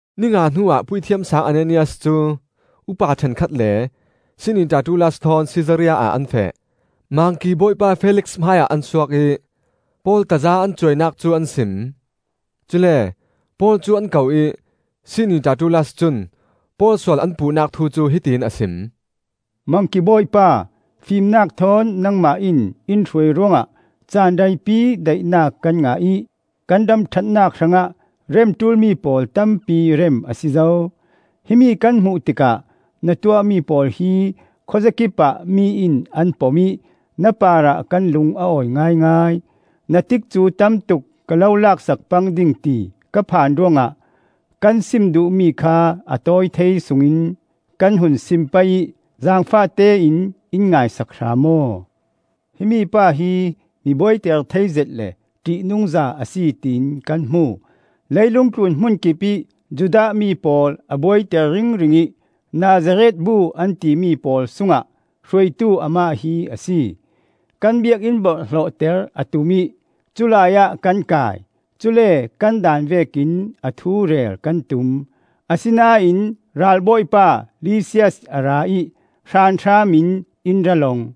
Ni nga hnuah Puithiam Saang Ananias cu upa ṭhenkhat le sih-ni Tertullas thawn Sisaria ah an feh. Mangki Bawipa Felix hmaiah an suak ih Paul taza an cuainak cu an sim. Cule Paul cu an ko ih sih-ni Tertullas cun Paul sual an puhnak thu cu hiti in a sim: “Mangki Bawipa, fimnak thawn nangmah in in hruai ruangah caan reipi daihnak kan ngah ih kan ram ṭhatnak hrangah rem ṭulmi pawl tampi rem a si zo. Himi kan hmuh tikah na tuahmi pawl hi khuazakipah mi in an pom ih na parah kan lung a awi ngaingai. Na tikcu tamtuk ka lo laksak pang ding ti ka phan ruangah kan sim duhmi kha a tawi thei sungin kan hun sim pei ih zaangfahte in in ngaisak hram aw. Himi pa hi mi buaiter theizet le ṭihnungza a si tiin kan hmu. Leilung tlun hmun kipih Judah mi pawl a buaiter ringring ih Nazareth bu an timi pawl sungah hruaitu amah hi a si. Kan Biakinn borhhlawhter a tum ih culai ah kan kai. (Cule kan daan vekin a thu rel kan tum; asinain ralbawipa Lisias a ra ih hranhram in in ra long.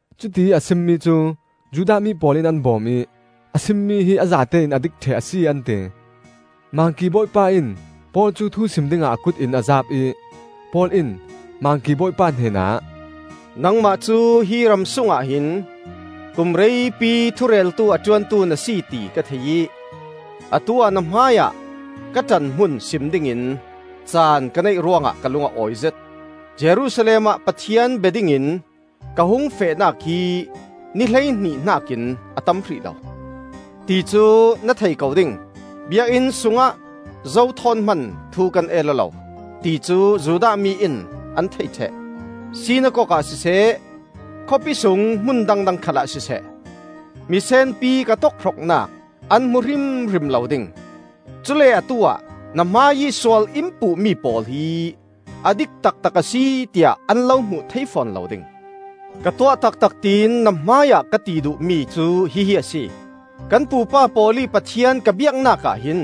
Cutiih a simmi cu Judah mi pawl in an bawm ih a simmi hi a zatein a dik ṭheh a si an ti. Mangki Bawipa in Paul cu thu sim dingah a kut in a zaap ih Paul in Mangki Bawipa hnen ah: “Nangmah cu hi ram sungah hin kum reipi thureltu a ṭuantu na si ti ka thei ih atu-ah na hmaiah ka ṭanhmun sim dingin caan ka neih ruangah ka lung a awizet. Jerusalem ah Pathian bia dingin ka hung fehnak hi ni hleihnih hnakin a tam hrih lo, ti cu na thei ko ding. Biakinn sungah zo thawn hman thu kan el aw lo, ti cu Judah mi in an thei ṭheh. Sinakok ah siseh, khawpi sung hmun dangdang khalah siseh, misenpi ka tokhroknak an hmu hrimhrim lo ding. Cule atu-ah na hmaiih sual in puhmi pawl hi a dik taktak a si tiah an lo hmuh thei fawn lo ding. Ka tuah taktak tiin na hmaiah ka ti duhmi cu hihi a si: Kan pupa pawl ih Pathian ka biaknak ah hin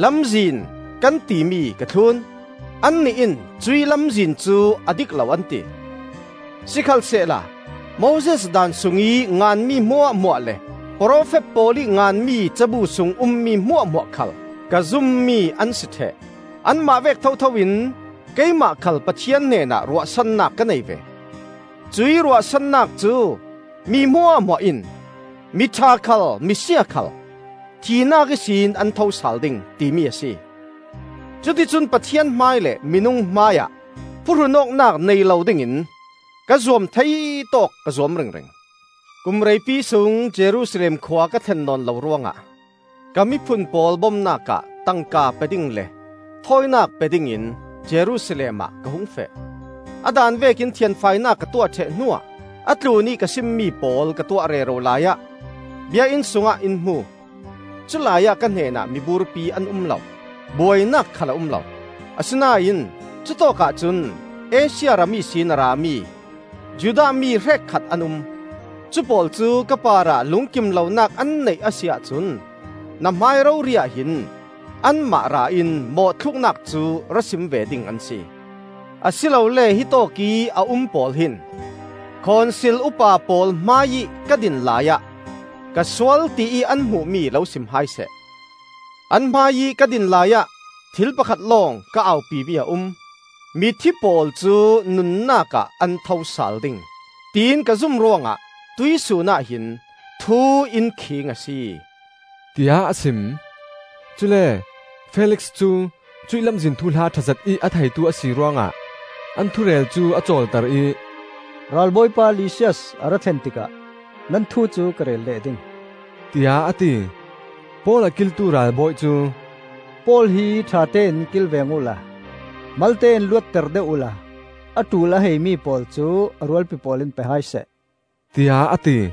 Lamzin kan timi ka thlun; annih in cuih Lamzin cu a dik lo an ti. Sikhalsehla Moses Daan sungih nganmi hmuahhmuah le profet pawl ih nganmi cabu sung ummi hmuahhmuah khal ka zummi an si ṭheh. Anmah vek thothoin keimah khal Pathian hnenah ruahsannak ka nei ve. Cuih ruahsannak cu, mi hmuahhmuah in, miṭha khal misia khal, thihnak ihsin an tho sal ding, timi a si. Cuti cun Pathian hmai le minung hmaiah phuhrun awknak nei lo dingin ka zuam thei tawk ka zuam ringring. “Kum reipi sung Jerusalem khua ka thlen nawn lo ruangah ka miphun pawl bomnak ah tangka pe ding le thawinak pe dingin Jerusalem ah ka hung feh. A daan vekin thianfainak ka tuah ṭheh hnuah a tlunih ka simmi pawl ka tuah rero laiah Biakinn sungah in hmu. Culai ah ka hnenah miburpi an um lo; buainak khal a um lo. Asinain cutawkah cun Asia ram ihsin a rami Judah mi hrekkhat an um. Cupawl cu ka parah lungkimlonak an neih a si ahcun na hmai rori-ah hin anmah ra in mawhthluknak cu ra sim ve ding an si. Asilole hitawk ih a um pawl hin Khonsil upa pawl hmaiih ka din laiah ka sual tiih an hmuhmi lo sim hai seh. An hmaiih ka din laiah thil pakhat lawng ka aupi mi a um: ‘Mithi pawl cu nunnak ah an tho sal ding,’ tiin ka zum ruangah tuihsun ah hin thu in khiing a si,” tiah a sim. Cule Felix cu cuih Lamzin thuhla ṭha zetih a theitu a si ruangah an thu rel cu a cawlter ih, “Ralbawipa Lisias a ra thlen tikah nan thu cu ka rel leh ding,” tiah a ti. Paul a kiltu ralbawi cu, “Paul hi ṭhatein kilveng uhla, malte in luatter deuh uhla a ṭul a haimi pawl cu a rualpi pawl in pe hai seh,” tiah a ti.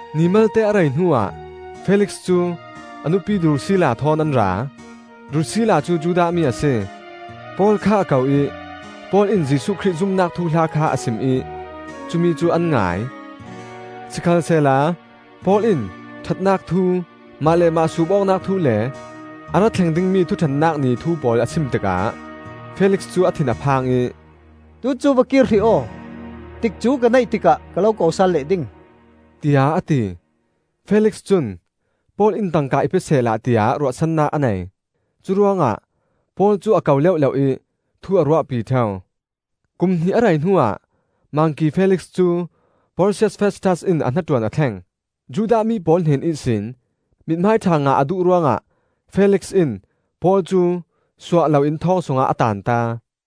Ni malte a rei hnuah Felix cu a nupi Drusilla thawn an ra. Drusilla cu Judah mi a si. Paul kha a ko ih Paul in Jesuh Khrih zumnak thuhla kha a sim ih cumi cu an ngai. Sikhalsehla Paul in ṭhatnak thu, mah le mah suup awknak thu le a ra thleng dingmi Thuṭhennak Ni thu pawl a sim tikah Felix cu a thin a phang ih, “Tu cu va kir hrih aw. Tikcu ka neih tikah ka lo ko sal leh ding,” tiah a ti. Felix cun Paul in tangka i pe sehla tiah ruahsannak a nei. Curuangah Paul cu a ko leuhleuh ih thu a ruahpi ṭheu. Kum hnih a rei hnuah Mangki Felix cu Porsius Festas in a hnaṭuan a thleng. Judah mi pawl hnen ihsin mithmai ṭha ngah a duh ruangah Felix in Paul cu suah loin thawng sungah a taanta.